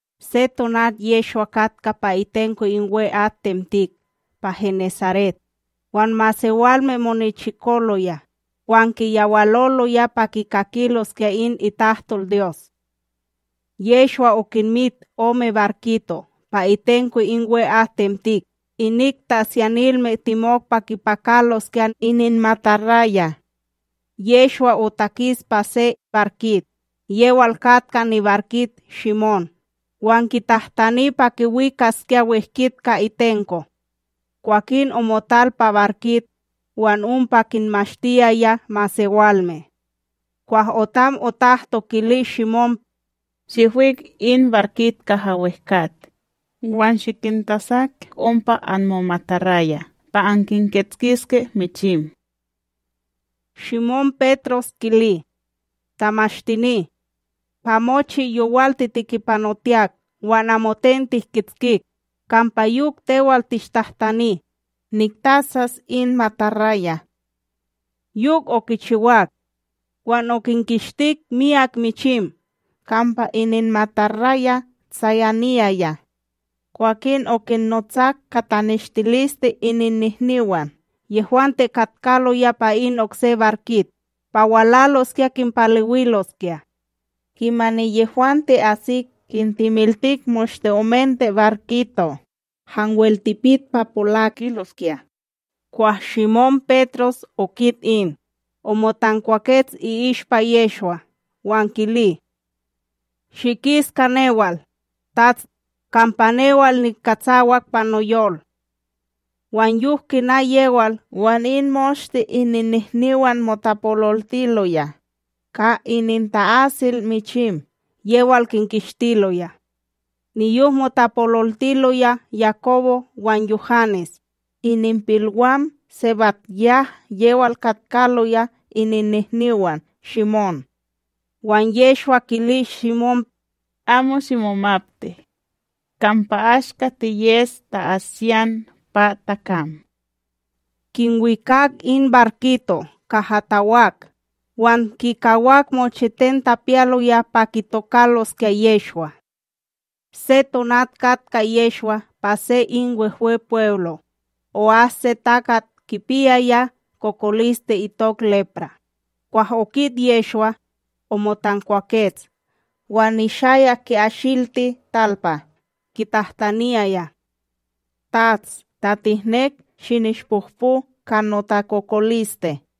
Se tonat Yehshwa katka pa itenko in we'atTemtik pa Genesaret; wan masewalme monichikoloya, wan kiyawaloloya pa kikakiloskya in ItahtolDyos. Yehshwa okinmit ome barkito' pa itenko in we'atTemtik, inik ta'asyanilme temok pa kipakaloskya ininmataraya. Yehshwa otakis pa se barkit, yewal katka nibarkit Shimón, wan kitahtani pa kiwikaskya wehkit ka itenko. Kwakin omotal pa barkit, wan ompa kinmashtiyaya masewalme. Kwah otam otahto, kili Shimón: ―Shihwik in barkit kaha wehkat, wan shikintasak ompa anmomataraya' pa ankinkishtiske michim. Shimón kili: ―Tamashtini, pa mochi yowal titikipanotiyak wan amoten tihkitskik; kampa yok tewal tishtahtani, niktasas in mataraya. Yok okichiwak, wan okinkishtik myak michim kampa ininmataraya' tsayaniyaya. Kwakin okinnotsak ka taneshtiliste ininnihniwan yehwante katkaloya pa in okse barkit, pa walaloskya kinpalewiloskya. Kimani yehwante asik kintemiltik moshte omente barkito' hanwel tipit pa polakiloskya. Kwah Shimón Petros okit in, omotankwakets i'ishpa Yehshwa wan kili: ―Shikis ka newal, TATS, kampa newal nikatsawak pa noyol. Wan yok kina yewal wan in moshte ininnihniwan motapololtiloya, ka ininta'asil michim yewal kinkishtiloya. Niyok motapololtiloya Yakobo wan Yuhanes, ininpilwam SebadYah, yewal katkaloya ininnihniwan Shimón. Wan Yehshwa kili Shimón: ―Amo shimomapti; kampa ashka tiyes ta'asiyan pa takam. Kinwikak in barkito' kaha tawak, wan kikawak mochiten tapiyaloya pa kitokaloskya Yehshwa. Se tonat katka Yehshwa pa se in Wehwepweblo, o'as se takat kipiyaya kokoliste itok lepra,a kwah okit Yehshwa, omotankwakets wan nishayak ki'asilti talpa kitahtaniyaya: ―Tats, ta tihnek, shinishpohpo ka notakokoliste.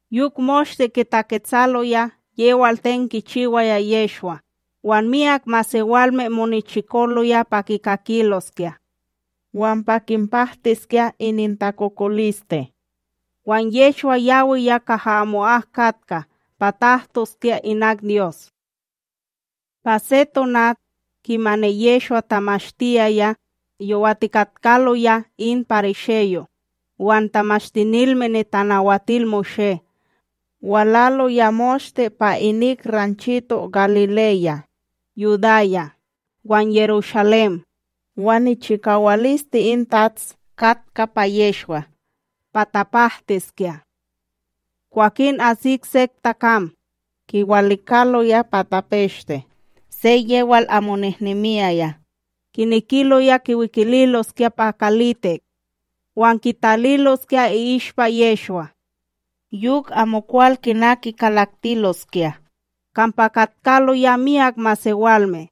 Yok moshte kitaketsaloya yewal ten kichiwaya Yehshwa, wan myak masewalme monichikoloya pa kikakiloskya wan pa kinpahtiskya inintakokoliste. Wan Yehshwa yawiya kaha amo'ak katka pa tahtoskya inak Dyos. Pa se tonat, kimani Yehshwa tamashtiyaya, yowatikatkaloya in parisheyo' wan Tamashtinilme NitanawatilMoshé walaloya moshte pa inik ranchito Galileya, Yudaya wan Yerushalém; wan nichikawaliste in TATS katka pa Yehshwa pa tapahtiskya. Kwakin asik sek takam kiwalikaloya pa tapeshte, se yewal amo nehnemiyaya, kinekiloya kiwikililoskya pa kalitik wan kitaliloskya i'ishpa Yehshwa. Yok amokwal kina kikalaktiloskya, kampa katkaloya myak masewalme.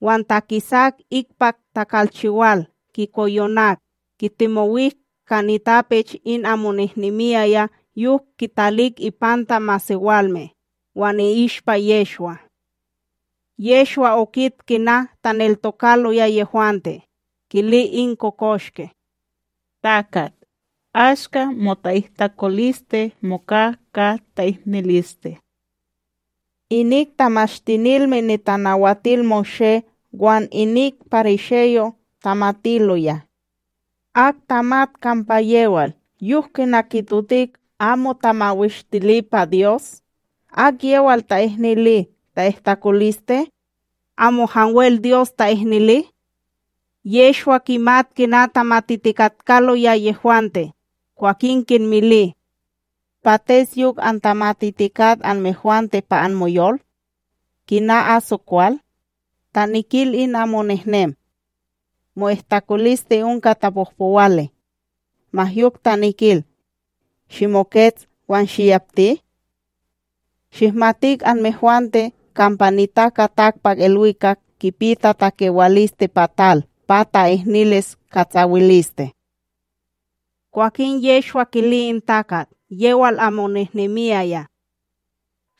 Wan takisak ikpak takalchiwal kikoyonak, kitemowik ka nitapech in amo nehnemiyaya yok kitalik ipanta masewalme, wan i'ishpa Yehshwa. Yehshwa okit kina taneltokaloya yehwante, kili in kokoshke: ―Takat, ashka mota'ihtakoliste moka ka ta'ihniliste. Inik Tamashtinilme NitanawatilMoshé wan inik parisheyo' tamatiloya: “Ak tamat kampa yewal, yok kina kitotik amoTamawishtili pa Dyos? Akyewal ta'ihnili ta'ihtakoliste? Amo hanwel Dyos ta'ihnili.” Yehshwa kimat kina tamatitikatkaloya yehwante, kwakin kinmili: ―Pates yok antamatitikat anmehwante pa anmoyol? Kina aso kwal? Ta nikil in amo nehnem: “Mo'ihtakoliste onka tapohpowali”, ma yok ta nikil: “Shimokets, wan shiyapti”? Shihmatik anmehwante kampa NitakaTakpakIlwikakb kipi tatakewaliste pa tal pa ta'ihnilis katsawiliste. Kwakin Yehshwa kili in takat yewal amo nehnemiyaya: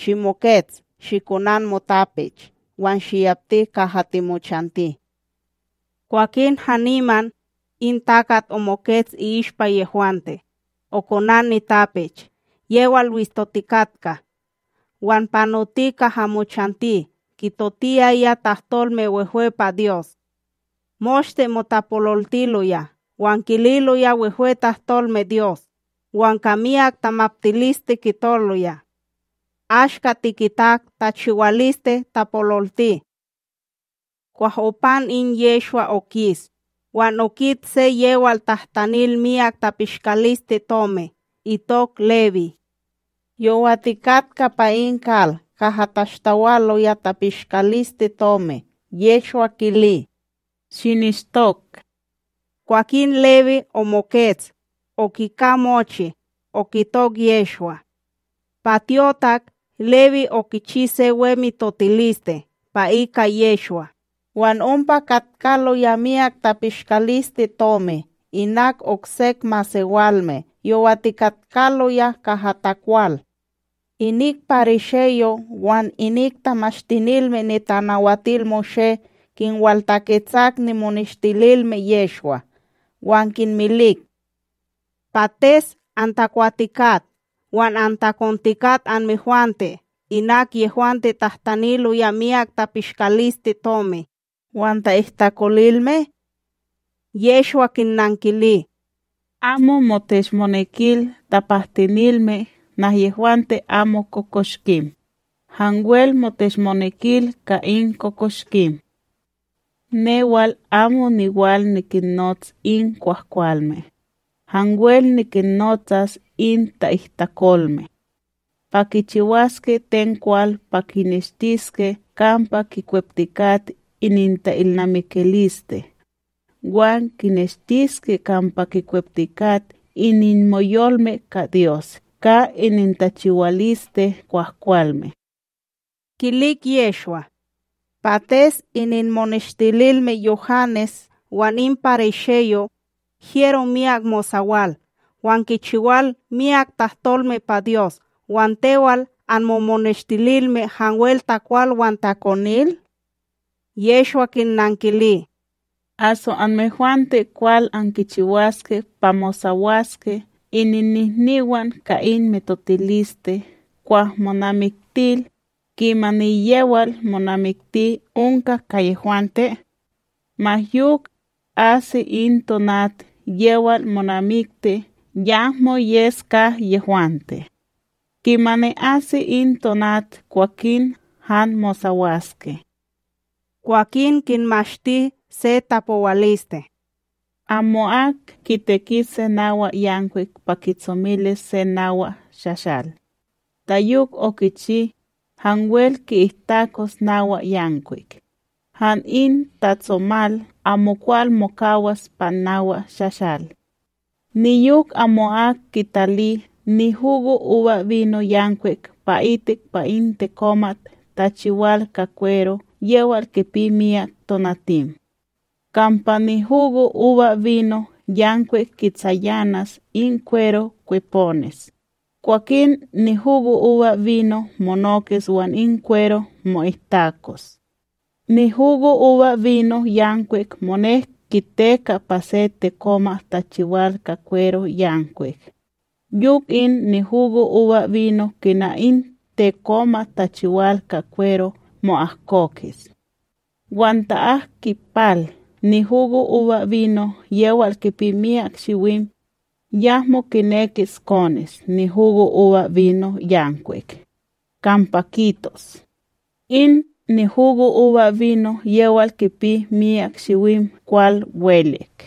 ―Shimokets, shikonan motapech wan shiyapti kaha timochanti. Kwakin haniman, in takat omokets i'ishpa yehwante, okonan nitapech yewal wistotikatka wan panoti kaha mochanti kitotiyaya tahtolme wehwe pa Dyos. Moshte motapololtiloya wan kililoya wehwe tahtolme Dyos, wan ka miyak tamaptiliste kitoloya: ―Aska tikitak tachiwaliste tapololti. Kwah opan in Yehshwa okis, wan okit se yewal tahtanil miyak tapishkalisteTomic itok Lewí, yowatikatka pa in kal kaha tashtawaloya tapishkalisteTomi, Yehshwa kili: ―Shinishtok. Kwakin Lewí omokets, okika mochi, okitok Yehshwa. Pa tyotak, Lewí okichi se we mitotiliste pa ika Yehshwa, wan ompa katkaloya miyak tapishkalisteTomi inak oksek masewalme yowatikatkaloya kaha takwal. Inik parisheyo' wan inik Tamashtinilme NitanawatilMoshé kinwaltaketsak nimoneshtililme Yehshwa, wan kinmilik: ―Pates antakwatikat wan antakontikat anmehwante inak yehwante tahtaniloya miyak tapishkalisteTomi wan ta'ihtakolilme? Yehshwa kinnankili: ―Amo moteshmonekil tapahtinilme nahyehwante amo kokoshkim, hanwel moteshmonekil ka in kokoshkim. Newal amo niwal nikinnots in kwahkwalme, hanwel nikinnotsas in ta'ihtakolme, pa kichiwaske ten kwal pa kineshtiske kampa kikweptikat ininta’ilnamikiliste wan kineshtiske kampa kikweptikat ininmoyolme ka Dyos ka inintachiwaliste kwahkwalme. Kilik Yehshwa: ―Pates ininmoneshtililme Yuhanes wan in parisheyo', hyero miyak mosawal wan kichiwal myak tahtolme pa Dyos wan tewal anmomoneshtililme hanwel takwal wan takonil? Yehshwa kinnankili: ―Aso anmehwante kwal ankichiwaske pa mosawaske ininnihniwan ka in mitotiliste kwah monamiktil, kimani yewal monamikti onka ka yehwante? Ma yok, asi in tonat yewal monamikti yahmo yes ka yehwante; kimani asi in tonat kwakin han mosawaske. Kwakin kinmashti se tapowaliste: ―Amo'ak kiteki se nawa yankwik pa kitsomilis se nawa shashal. Ta yok okichi, hanwel ki'ihtakos nawa yankwik; han in tatsomal amokwal mokawas pa nawa shashal. Niyok amo'ak kitali nihugoUbaBino yankwik pa'itik pa in tekomat tachiwal ka kwero yewal kipi miyak tonatim; kampa nihugoUbaBino yankwik kitsayanas in kwero kweponis, kwakin nihugoUbaBino monokis wan in kwero mo'ihtakos. NihugoUbaBino yankwik monek kiteka pa se tekomat tachiwal ka kwero yankwik, yok in nihugoUbaBino kina in tekomat tachiwal ka kwero mo'ahkokis. Wan ta ak kipal nihugoUbaBino yewal kipi miyak shiwim, yahmo kinekis kones nihugoUbaBino yankwik, kampa kitos: “In nihugoUbaBino yewal kipi miyak shiwim kwal welek.”